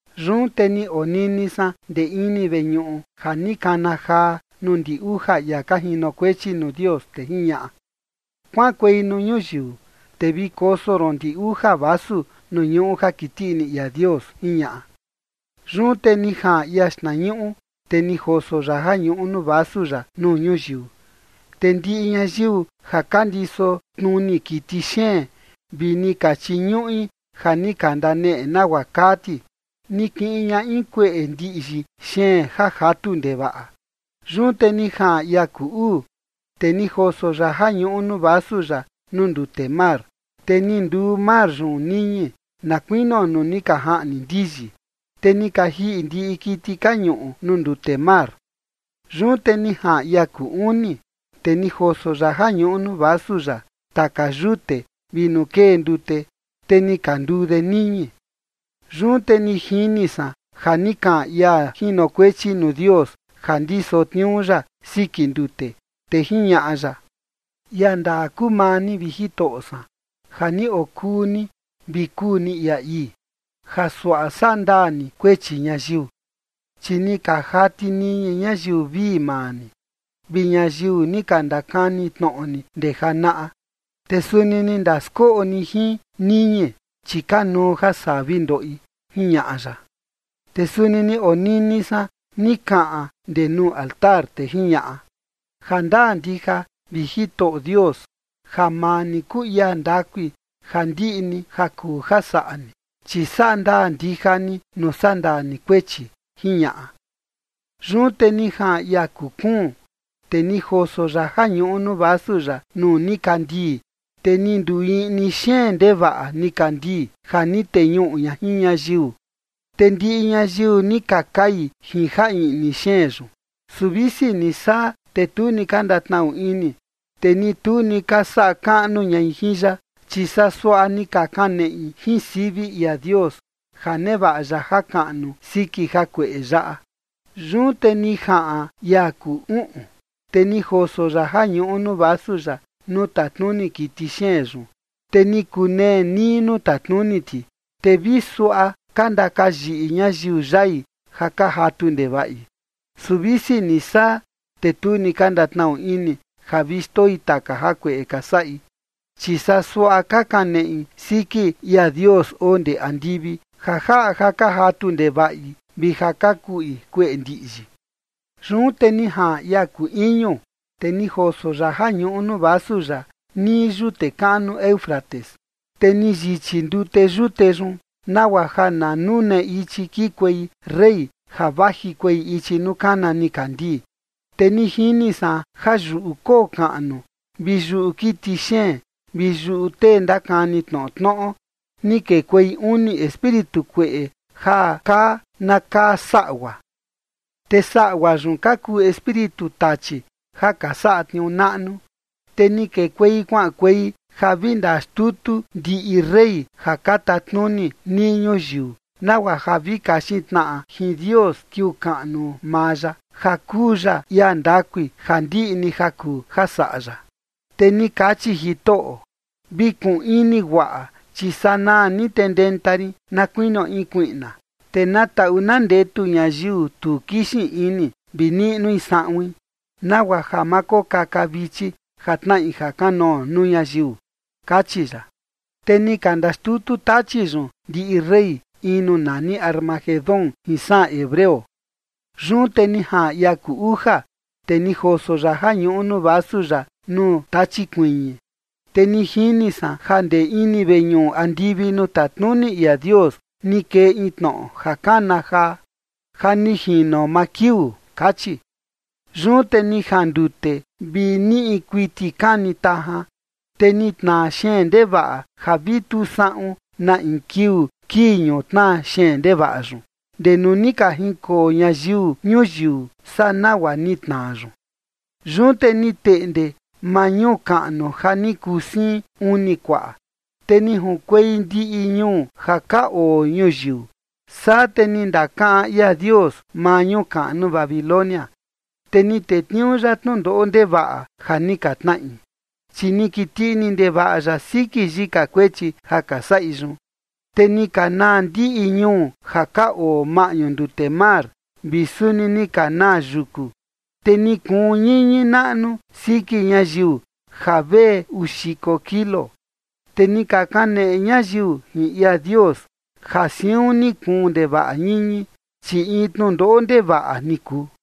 Yun te ni onini san ndee ini veñuꞌu ja ni kana jaa nuu ndi uja ia ka jinokuechi nuu Dios, te jiñaꞌa: ―Kuaꞌankuei nuu ñuyiu, te vi koso ron ndi uja vasu nuu ñuꞌu ja kiti ini ia Dios ―jiñaꞌa. Yun te ni jaꞌan ia xtnañuꞌu, te ni joso ya ja ñuꞌu nuu vasu ya nuu ñuyiu. Te ndiꞌi ñayiu ja ka ndiso tnuni kiti xeen vi ni ka chiñuꞌi ja ni ka ndaneꞌe nagua kaa ti, ni kiꞌin ña in kueꞌe ndiꞌyi xeen ja jatu ndevaꞌa. Yun te ni jaꞌan ia kuu uu, te ni joso ya ja ñuꞌu nuu vasu ya nuu ndute mar, te ni nduu mar yun niñi, na kuinio nuu ni ka jaꞌni ndiyi, te ni ka jiꞌi ndiꞌi kiti ka ñuꞌu nuu ndute mar. Yun te ni jaꞌan ia kuu uni, te ni joso ya ja ñuꞌu nuu vasu ya taka yute vi nuu kee ndute, te ni ka nduu de niñi. Yun te ni jini san ja ni kaꞌan ia jinokuechi nuu Dios ja ndiso tniuu ya siki ndute, te jiñaꞌa ya: Ia ndaa kuu maa ni, vi Jitoꞌo san, ja ni okuu ni vi kuu ni ia ii, ja suaꞌa sandaa ni kuechi ñayiu, chi ni ka jati niñi ñayiu vii maa ni, vi ñayiu ni ka ndakani tnoꞌo ni ndee janaꞌa. Te suni ni ndaskoꞌo ni jin niñi, chi kanuu ja saa vi ndoꞌi. Jiñaꞌa ya. Te suni ni onini san ni kaꞌan ndee nuu altar, te jiñaꞌa: ―Jandaa ndija, vi Jitoꞌo Dios, ja maa ni kuu ia ndakui ja ndiꞌi ni ja kuu ja saꞌa ni, chi saꞌa ndaa ndija ni nuu sandaa ni kuechi ―jiñaꞌa. Yun te ni jaꞌan ia kuu kuun, te ni joso ya ja ñuꞌu nuu vasu ya nuu nikandii, te ni nduu iꞌni xeen ndaꞌa nikandii ja ni teñuꞌu ña jin ñayiu. Te ndiꞌi ñayiu ni ka kai jin ja iꞌni xeen yun. Su visi ni saa, te tu ni ka ndatnaꞌu ini, te ni tu ni ka saꞌa kaꞌnu ñai jin ya, chi saa suaꞌa ni ka kaneꞌi jin sivi ia Dios, ja nevaꞌa ya jakaꞌnu siki jakueꞌe yaꞌa. Yun te ni jaꞌan ia kuu uꞌun, te ni joso ya ja ñuꞌu nuu vasu ya nuu tatnuni kiti xeen yun, te ni kunee nii nuu tatnuni ti. Te vi suaꞌa ka ndakayiꞌi ñayiu yai ja ka jatu ndevaꞌi. Su visi ni saa, te tu ni ka ndatnaꞌu ini ja vi xndoi taka jakueꞌe ka saꞌi, chi saa suaꞌa ka kaneꞌi siki ia Dios oo ndee andivi, ja jaꞌa ja ka jatu ndevaꞌi vi ja ka kuꞌi kueꞌe ndiꞌyi. Yun te ni jaꞌan ia kuu iñu, te ni joso ya ja ñuꞌu nuu vasu ya nii yute kaꞌnu Éufrates, te ni yichi ndute yute yun, nagua ja na nune ichi kikuei rey ja vajikuei ichi nuu kana nikandii. Te ni jini san ja yuꞌu koo kaꞌnu vi yuꞌu kiti xeen vi yuꞌu tee ndakani tnoꞌo tnoꞌo, ni kekuei uni espíritu kueꞌe ja kaa na kaa saꞌgua. Te saꞌgua yun ka kuu espíritu tachi ja ka saꞌa tniuu naꞌnu, te ni kekuei kuaꞌankuei ja vi ndaxtutu ndiꞌi rey ja ka tatnuni nii ñuyiu, nagua ja vi kaxin tnaꞌa jin Dios kiuu kaꞌnu maa ya, ja kuu ya ia ndakui ja ndiꞌi ni ja kuu ja saꞌa ya. Te ni kachi Jitoꞌo: ―Vi kuun ini guaꞌa, chi sanaa ni te ndenta rin na kuinio in kuiꞌna. Te na taꞌu na ndetu ñayiu tu kixin ini vi niꞌnui saꞌuin, nagua ja ma kokaka vichi ja tnaꞌi ja kanoo nuu ñayiu ―kachi ya. Te ni ka ndaxtutu tachi yun ndiꞌi rey, in nuu nani Armagedón jin saꞌan hebreo. Yun te ni jaꞌan ia kuu uja, te ni joso ya ja ñuꞌu nuu vasu ya nuu tachi kuiñi. Te ni jini san ja ndee ini veñuꞌu andivi nuu tatnuni ia Dios ni kee in tnoꞌo ja kana jaa: ―Ja ni jino maa kiuu ―kachi. Yun te ni jandute, te vi niꞌi kuiti kani tajan, te ni tnaa xeen ndevaꞌa, ja vi tu saꞌun na in kiuu kii ñutnaa xeen ndevaꞌa yun, ndee nuu ni ka jinkoo ñayiu ñuyiu saa nagua ni tnaa yun. Yun te ni teꞌnde maa ñuu kaꞌnu ja ni kuu siin uni kuaꞌa, te ni junkuei ndiꞌi ñuu ja ka oo ñuyiu. Saa te ni ndakaꞌan ia Dios maa ñuu kaꞌnu Babilonia, te ni tetniuu ya tnundoꞌo ndevaꞌa ja ni ka tnaꞌi, chi ni kiti ndevaꞌa ini ya siki yika kuechi ja ka saꞌi yun. Te ni ka naa ndiꞌi ñuu ja ka oo maꞌñu ndute mar, vi suni ni ka naa yuku. Te ni kuun ñiñi naꞌnu siki ñayiu ja vee uu xiko kilo. Te ni ka kaneꞌe ñayiu jin ia Dios, ja siun ni kuun ndevaꞌa ñiñi, chi in tnundoꞌo ndevaꞌa ni kuu.